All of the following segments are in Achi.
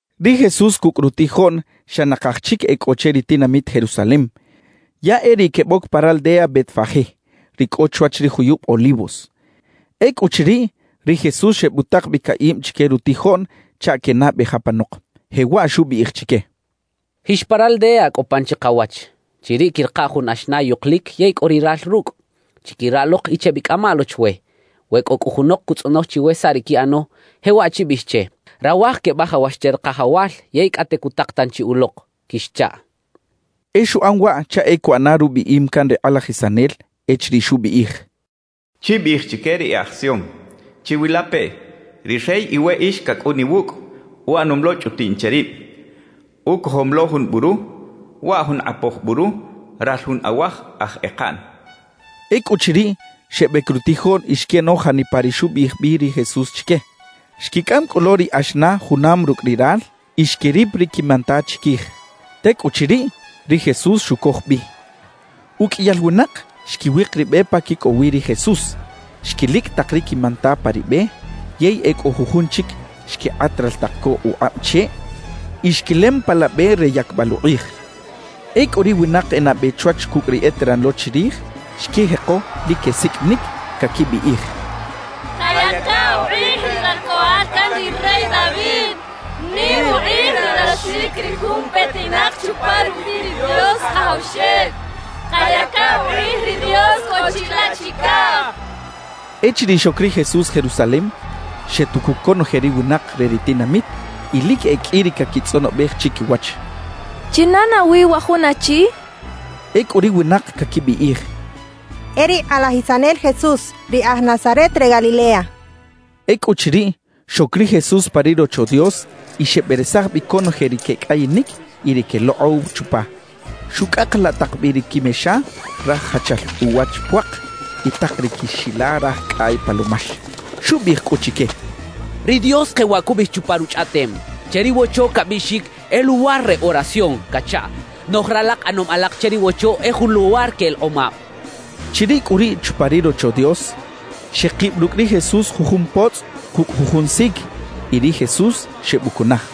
Ri Jesús cucꞌ rutijoꞌn xa nakaj chic e cꞌo che ri tinamit Jerusalem, ya e riꞌ queboc pa raldea Betfagé, ri cꞌo chwach ri juyub Olivos. Ecꞌuchiriꞌ, ri Jesús xebutak bi caꞌib chique rutijoꞌn chaꞌ quenabej apanok, jewaꞌ xubiꞌij chique: «Jix pa raldea cꞌo pan chikawach. Chiriꞌ quiꞌrika jun axna yukulic yey cꞌo ri ral rucꞌ. Chiquira lok y chebicꞌama lo chwe. We cꞌo cꞌu junok cutzꞌonoj chiwe saꞌ ri quiꞌano, jewaꞌ chibiꞌij che: “Rawaj quebajawax che ri Kajawal, yey cꞌate cutak tanchi ulok” quixchaꞌ.» E xuꞌan waꞌ chaꞌ e cuꞌana rubiꞌim can ri kꞌalajisanel echiriꞌ xubiꞌij: Chibiꞌij chique ri e aj Sion: “Chiwilapeꞌ, ri Rey iweꞌix cacꞌun iwucꞌ, uꞌanom lo chꞌutiꞌn che rib; ucojom lo jun buru, waꞌ jun kꞌapoj buru, ral jun awaj aj ekaꞌn” xchaꞌ. Ecꞌuchiriꞌ, xebec rutijoꞌn y xquiꞌano janipa ri xubiꞌij bi ri Jesús chique. Xquicꞌam cꞌu lo ri axna junam rucꞌ ri ral y xquirip ri quimanta chiquij. Tecꞌuchiriꞌ, ri Jesús xucoj bi. Uqꞌuiyal winak xquiwik ri be pa quicꞌow wi ri Jesús, xquilicꞌ tak ri quimanta pa ri be; yey e cꞌo jujun chic xquikꞌat raltak co ukꞌab cheꞌ y xquilem pa la be re yacbal ukꞌij. Ecꞌu ri winak e nabe chwach cucꞌ ri eteran lo chirij xquijeko lic quesiqꞌuinic, caquibiꞌij: «¡Kayaca ukꞌij ri Ralcꞌoꞌal can ri rey David! ¡Nim ukꞌij ralaxic ri jun petinak chupa rubiꞌ ri Dios Kajawxel! ¡Kayaca ukꞌij ri Dios cꞌo chilaꞌ chicaj!» quechaꞌ. Echiriꞌ xoc ri Jesús Jerusalem, xetucuc conoje ri winak re ri tinamit y lic e qꞌui ri caquitzꞌonobej chiquiwach: —¿China nawi wa jun achi? —quechaꞌ. Ecꞌu ri winak caquibiꞌij: —E ri kꞌalajisanel Jesús, ri aj Nazaret re Galilea —quechaꞌ. Ecꞌuchiriꞌ, xoc ri Jesús pa ri Rocho Dios y xeberesaj bi conoje ri quecꞌayinic y ri quelokꞌow chupa. Xucꞌakalaꞌ tak bi ri quimexa raj jachal uwach puak y tak ri quixila raj cꞌay palomax. Xubiꞌij cꞌu chique: «Ri Dios jewaꞌ cubiꞌij chupa Ruchꞌaꞌtem: Che ri Wocho cabiꞌxic: “E luwar re oración” cachaꞌ. Noꞌj ralak ꞌanom alak che ri Wocho e jun luwar que elekꞌomab» xchaꞌ. Chiriꞌ cꞌu riꞌ chupa ri Rocho Dios, xekib rucꞌ ri Jesús jujun potzꞌ cucꞌ jujun sic, y ri Jesús xebucunaj.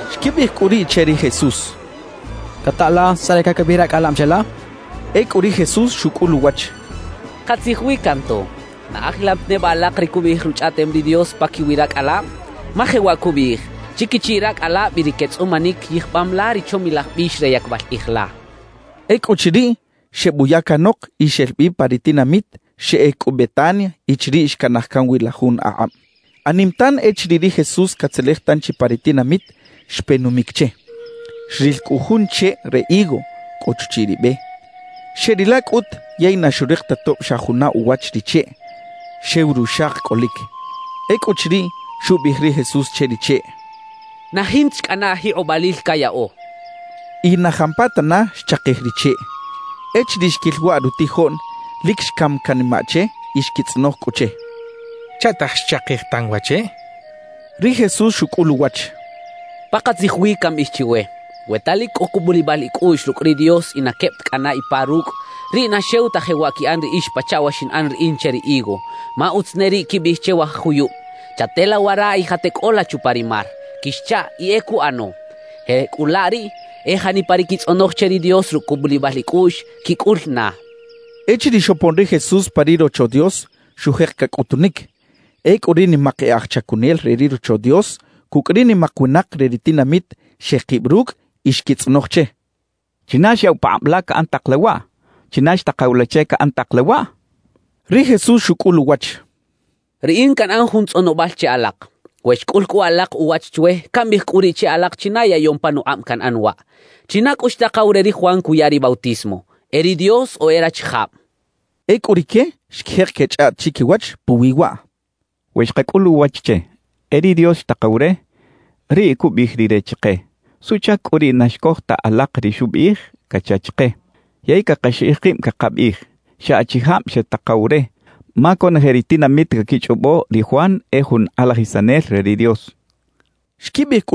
Xquibiꞌij cꞌu riꞌ che ri Jesús: —¿Cata la saꞌ ri caquibiꞌij racꞌalab cheꞌla? —xechaꞌ. Ecꞌu ri Jesús xucꞌul uwach: —Katzij wi canto. ¿Na ajilam ta neba alak ri cubiꞌij Ruchꞌaꞌtem ri Dios paquiwi racꞌalab? Ma jewaꞌ cubiꞌij: Chiquichiꞌ racꞌalab y ri quetzꞌumanic yijbam la ri chomilaj bix re yacbal kꞌij la —xcha ri Jesús. Ecꞌuchiriꞌ, xebuya canok y xel bi pa ri tinamit; xeꞌec cꞌu Betania y chiriꞌ xcanaj can wi la jun akꞌab. Anim tan, echiriꞌ ri Jesús catzelej tanchi pa ri tinamit, xpe numic che. Xril cꞌu jun cheꞌ re higo cꞌo chuchiꞌ ri be. Xeꞌrilaꞌ cꞌut yey na xurik ta tob xa juna uwach ri cheꞌ, xew ruxak cꞌolic. Ecꞌuchiriꞌ, xubiꞌij ri Jesús che ri cheꞌ: —¡Na jinta chi cꞌana ajikꞌobalil cayaꞌo! —xchaꞌ. Y na jampatana xchakij ri cheꞌ. Echiriꞌ xquil waꞌ rutijoꞌn, lic xcam canimaꞌ che y xquitzꞌonoj cꞌu che: —¿Chaꞌtaj xchakij tan wa cheꞌ? —xechaꞌ. Ri Jesús xucꞌul uwach: —Pakatzij wi cambiꞌij chiwe: We ta lic cꞌo cubulibal icꞌuꞌx rucꞌ ri Dios y na queb ta cꞌana ipa rucꞌ, riꞌ na xew ta jewaꞌ quiꞌan riꞌix pachaꞌ wa xinꞌan riꞌin che ri higo. Ma utz ne riꞌ quibiꞌij che wa juyub: “Chatela wara y jateꞌcꞌola chupa ri mar” quixchaꞌ y e cuꞌano. Jecꞌulaꞌ riꞌ, e janipa ri quitzꞌonoj che ri Dios rucꞌ cubulibal icꞌuꞌx, quicꞌul na —xchaꞌ. Echiriꞌ xopon ri Jesús pa ri Rocho Dios, xujek cacꞌutunic. Ecꞌu ri nimak e aj chacunel re ri Rocho Dios cucꞌ ri nimak winak re ri tinamit xekib rucꞌ y xquitzꞌonoj che: —¿China xyaꞌw pakꞌab la caꞌan tak la waꞌ? ¿China xtakaw la che caꞌan tak la waꞌ? —xechaꞌ. Ri Jesús xucꞌul uwach: —Riꞌin canꞌan jun tzꞌonobal che alak. We xcꞌul alak uwach chwe, cambiꞌij cꞌu riꞌ che alak china yaꞌyom panukꞌab canꞌan waꞌ. ¿China cꞌu xtakaw re ri Juan cuya ri bautismo? ¿E ri Dios o e rachijab? —xchaꞌ. Ecꞌu rique xquijek quechꞌaꞌt chiquiwach puwi waꞌ: «We xkacꞌul uwach che: “E ri Dios xtakaw re”, riꞌ cubiꞌij rire chike: “¿Suꞌchac cꞌu riꞌ na xcoj ta alak ri xubiꞌij?” cacha chike. Yey cakaxiꞌij kib cakabiꞌij: “Xa achijab xetakaw re” ma conoje ri tinamit caquichꞌobo ri Juan e jun kꞌalajisanel re ri Dios» xecha chiquiwach.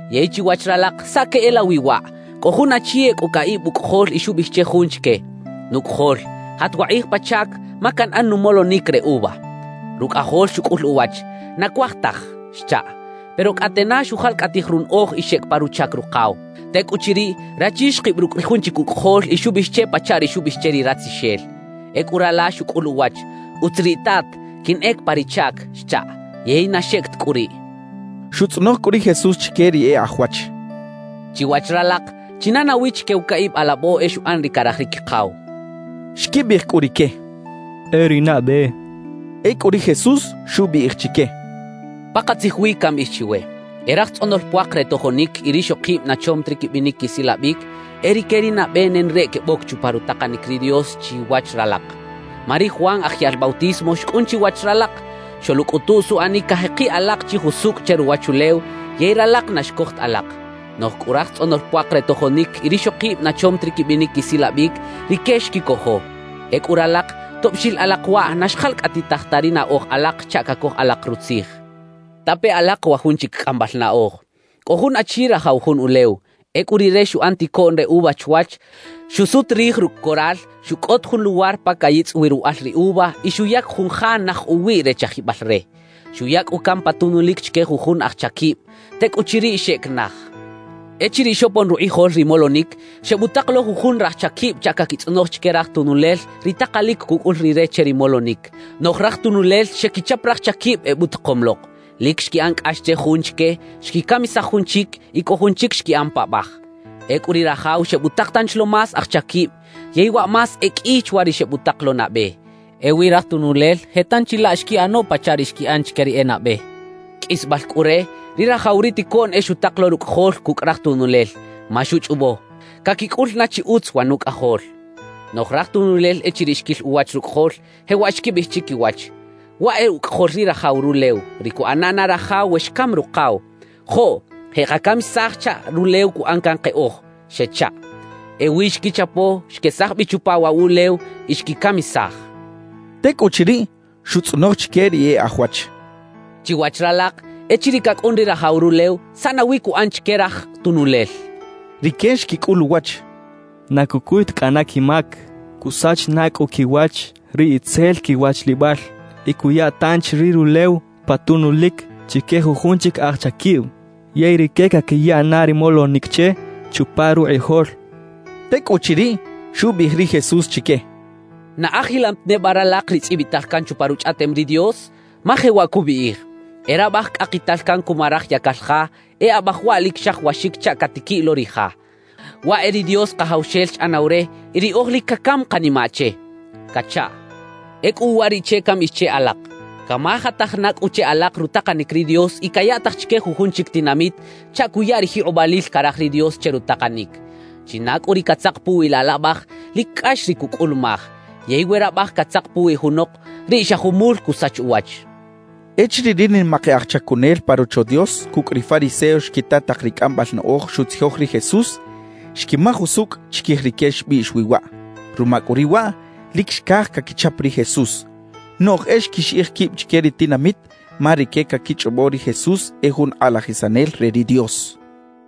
»Yey chiwach ralak ¿saꞌ queꞌelawi waꞌ? Cꞌo jun achi e cꞌo caꞌib ucꞌajol y xubiꞌij che jun chique: “Nucꞌajol, jat wakꞌij pa chac, ma canꞌan numolonic re uva.” »Rucꞌajol xucꞌul uwach: “Na cuaj taj” xchaꞌ. Pero cꞌate na xujalcꞌatij runaꞌoj y xeꞌec pa ruchac rukaw. Tecꞌuchiriꞌ, rachi xkib rucꞌ ri jun chic ucꞌajol y xubiꞌij che pachaꞌ ri xubiꞌij che ri ratzixel. »Ecꞌu rala xucꞌul uwach: “Utz riꞌ, tat, quinꞌec pa ri chac” xchaꞌ. Yey na xeꞌec ta cꞌu riꞌ.» Xutzꞌonoj cꞌu ri Jesús chique ri e aj wach: —Chiwach ralak, ¿china nawi chique wa caꞌib alabo e xuꞌan ri caraj ri quikaw? —xchaꞌ. Xquibiꞌij cꞌu rique: —E ri nabe —xechaꞌ. Ecꞌu ri Jesús xubiꞌij chique: «Pakatzij wi cambiꞌij chiwe: E raj tzꞌonol puak re tojonic y rixokib na chom ta ri quibinic quisilabic, e rique ri nabe nenareꞌ queboc chupa rutakanic ri Dios chiwach ralak. Ma ri Juan Aj Yaꞌl Bautismo xcꞌun chiwach ralak, xoluꞌcꞌutuꞌ suꞌanic cajekiꞌ alak chi jusucꞌ che ruwachulew, yey ralak na xcoj ta alak. Noꞌj cꞌu raj tzꞌonol puak re tojonic y rixokib na chom ta ri quibinic quisilabic, rique xquicojo. Ecꞌu ralak, tob xil alak waꞌ, na xjalcꞌatij ta ri naꞌoj alak chaꞌ cacoj alak rutzij. »Tape alak wa jun chic cꞌambal naꞌoj: Cꞌo jun achi rajaw jun ulew. Ecꞌu rire xuꞌan ticoꞌn re uva chwach. Xusut rij rucꞌ coral, xucꞌot jun luwar pa cayitzꞌ wi ruwaꞌal ri uva y xuyac jun ja naj uwiꞌ re chajibal re. Xuya cꞌu can pa tunulic chique jujun aj chaquib. Tecꞌuchiriꞌ, xeꞌec naj. »Echiriꞌ xopon rukꞌijol ri molonic, xebutak lo jujun raj chaquib chaꞌ caquitzꞌonoj chique raj tunulel ri takalic cucꞌul rire che ri molonic. Noꞌj raj tunulel xequichap raj chaquib ebutakom lok. Lic xquiꞌan cꞌax che jun chique, xquicamisaj jun chic y cꞌo jun chic xquiꞌan paꞌbaj. »Ecꞌu ri rajaw xebutak tanchi lo más aj chaquib, yey waꞌ más e qꞌui chwa ri xebutak lo nabe. Ewi raj tunulel je tanchi laꞌ xquiꞌano pachaꞌ ri xquiꞌan chique ri e nabe. »Qꞌuisbal cꞌu re, ri rajaw ri ticoꞌn e xutak lo rucꞌajol cucꞌ raj tunulel, ma xuchꞌobo: Caquicꞌul na chi utz wa nucꞌajol. »Noꞌj raj tunulel echiriꞌ xquil uwach rucꞌajol, jewaꞌ xquibiꞌij chiquiwach: “Waꞌ e ucꞌajol ri rajaw rulew, ri cuꞌana na rajaw we xcam rukaw. Joꞌ jeꞌkacamisaj chaꞌ rulew cuꞌan can keꞌoj” xechaꞌ. »Ewi xquichapo, xquesaj bi chupa waꞌ wuꞌlew y xquicamisaj» xcha ri Jesús. Tecꞌuchiriꞌ, xutzꞌonoj chique ri e aj wach: —Chiwach ralak, echiriꞌ cacꞌun ri rajaw rulew, ¿saꞌ nawi cuꞌan chique raj tunulel? —xchaꞌ. Rique xquicꞌul uwach: —Na cucuy ta cꞌana quimac. Cusach na cꞌu quiwach ri itzel quiwachlibal y cuya tanchi ri rulew pa tunulic chique jujun chic aj chaquib, yey rique caquiya na ri molonic che chupa rukꞌijol —xchaꞌ. Tecꞌuchiriꞌ, xubiꞌij ri Jesús chique: —¿Na ajilam ta neba ralak ri tzꞌibital can chupa Ruchꞌaꞌtem ri Dios? Ma jewaꞌ cubiꞌij: E rabaj cꞌakital can cuma raj yacal ja, e abaj waꞌ lic xajawaxic chaꞌ catiquiꞌ lo ri ja. Waꞌ e ri Dios Kajawxel xꞌanaw re y riꞌoj lic cacam kanimaꞌ che cachaꞌ. Ecꞌu uwariꞌche cambiꞌij che alak: Camajataj na cꞌu che alak rutakanic ri Dios y cayaꞌtaj chique jujun chic tinamit chaꞌ cuya ri jikꞌobalil caraj ri Dios che rutakanic. China cꞌu ri catzak puwi laꞌ laꞌbaj, lic cꞌax ri cucꞌulumaj; yey we rabaj catzak puwi junok, riꞌ xa jumul cusach uwach —xchaꞌ. Echiriꞌ ri nimak e aj chacunel pa Rocho Dios cucꞌ ri fariseos xquita tak ri cꞌambal naꞌoj xutzijoj ri Jesús, xquimaj usucꞌ chiquij rique xbiꞌx wi waꞌ. Ruma cꞌu riꞌ waꞌ, lic xcaj caquichap ri Jesús; noꞌj e xquixiꞌij quib chique ri tinamit ma rique caquichꞌobo ri Jesús e jun kꞌalajisanel re ri Dios.